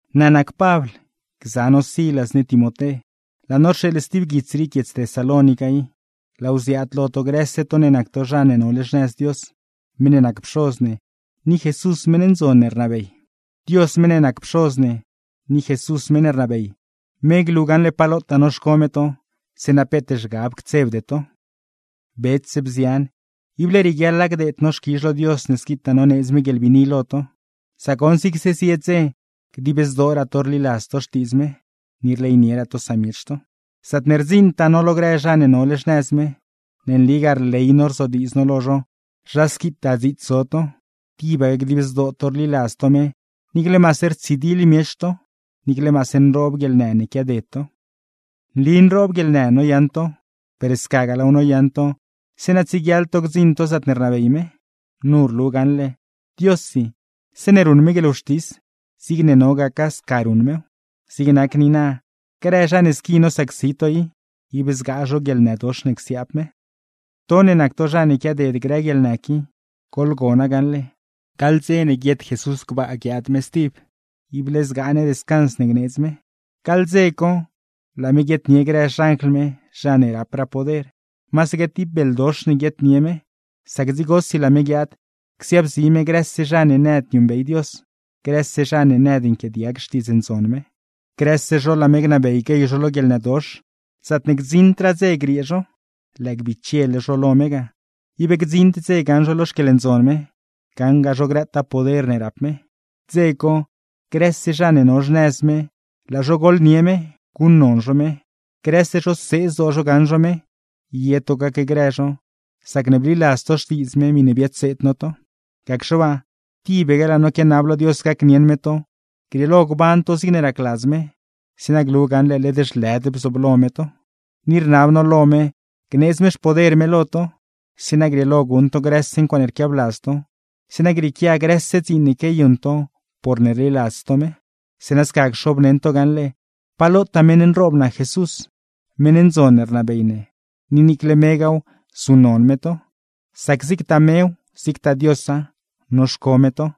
Naa nac Pabl, gza no Silas ni Timoté; laa no rxeeḻ stib guits rii guiedz Tesalónica i, laaw ziaad lo to grëse to ne nac to zha ne nole xnëz Dios, meṉ ne nac Pxoz ne, ni Jesús meṉ ndzon ne rnabey. Dios meṉ ne nac Pxoz ne, ni Jesús meṉ ne rnabey, me glu gaṉle pa lotaa noxco me to, zeeṉa peet zhgab ctsebde to. Bets, bzian, ible rieguiaḻa gdeed no xquizh lo Dios ne squitaa noneedz me guieḻbiini lo to; sac goṉ zigse zie dze dib zdooraa to rliladz to Xtiidz me, ni rleynieraa to samiech to. Zaatne rdziṉtaa no lo grë zha ne nole xnëz me, ne nligaa rley no rzodiidz no lo zho zha squitaa dziits zo to, tibaque dib zdoo to rliladz to me niicle maase rtsidiḻ miech to, niicle maase nroob guieḻnë ne quiaded to. Nli nroob guieḻnë noyaṉ to, per scagaa laaw noyaṉ to zeeṉa tsieguiaḻ to gdziṉ to zaatne rnabey me. Nu rlu gaṉle, Diossi zeeṉe ruṉ me guieḻwxtis, zigne no gaca sca ruṉ mew. Zig nac niina, grë zha ne squi nosacsi to i, ib zgaa zho guieḻnëdox ne csiaab me. To ne nac to zha ne quiaded grë guieḻnë qui, goḻgona gaṉle, gaḻ dze ne guiet Jesús gbaa guiaad me stib, ible zgaa ne descans ne gneedz me. Gaḻ dze co, laa me guietnie grë xanjl me, zha ne rapraa poder; masaque tib beldox ne guietnie me, sac dzigosi laa me guiaad csiaabzi me grëse zha ne nëd niuṉbey Dios, grëse zha ne nëd nquiaadiag Xtiidz Ndzon me. Grëse zho laa me gnabey guey zho lo guieḻnëdox, zaatne gdziṉdraa dze griee zho. Lëë bichele zho lo me ga, ib gdziṉd dze gaṉ zho lo xquieḻndzon me, gaṉgaa zho grëtaa poder ne rap me. Dze co, grëse zha ne no xnëz me laa zho gooḻnie me, guṉnon zho me. Grëse zho see zdoo zho gaṉ zho me; ye to gacgrë zho, sacne bliladz to Xtiidz me miṉe biadseed no to. Gacxe waa, tibaque laa no quianab lo Dios gacnieṉ me to grieelo gban to zigne racladz me; zeeṉa glu gaṉle led zhlëd bzooblo me to. Ni rnab no lo me gneedz me xpoder me lo to, zeeṉa grieelo guṉ to grëse ncuaaṉe rquiabladz to, zeeṉa grieequia grëse dziin ne quiayuṉ to porne rliladz to me. Zeeṉa sca cxobneṉ to gaṉle pa lotaa meṉ nroob nac Jesús, meṉ ndzon ne rnabey ne; ni niicle megaaw, zuṉnon me to. Sac zigtaa mew, zigtagaa Diosa, noxco me to.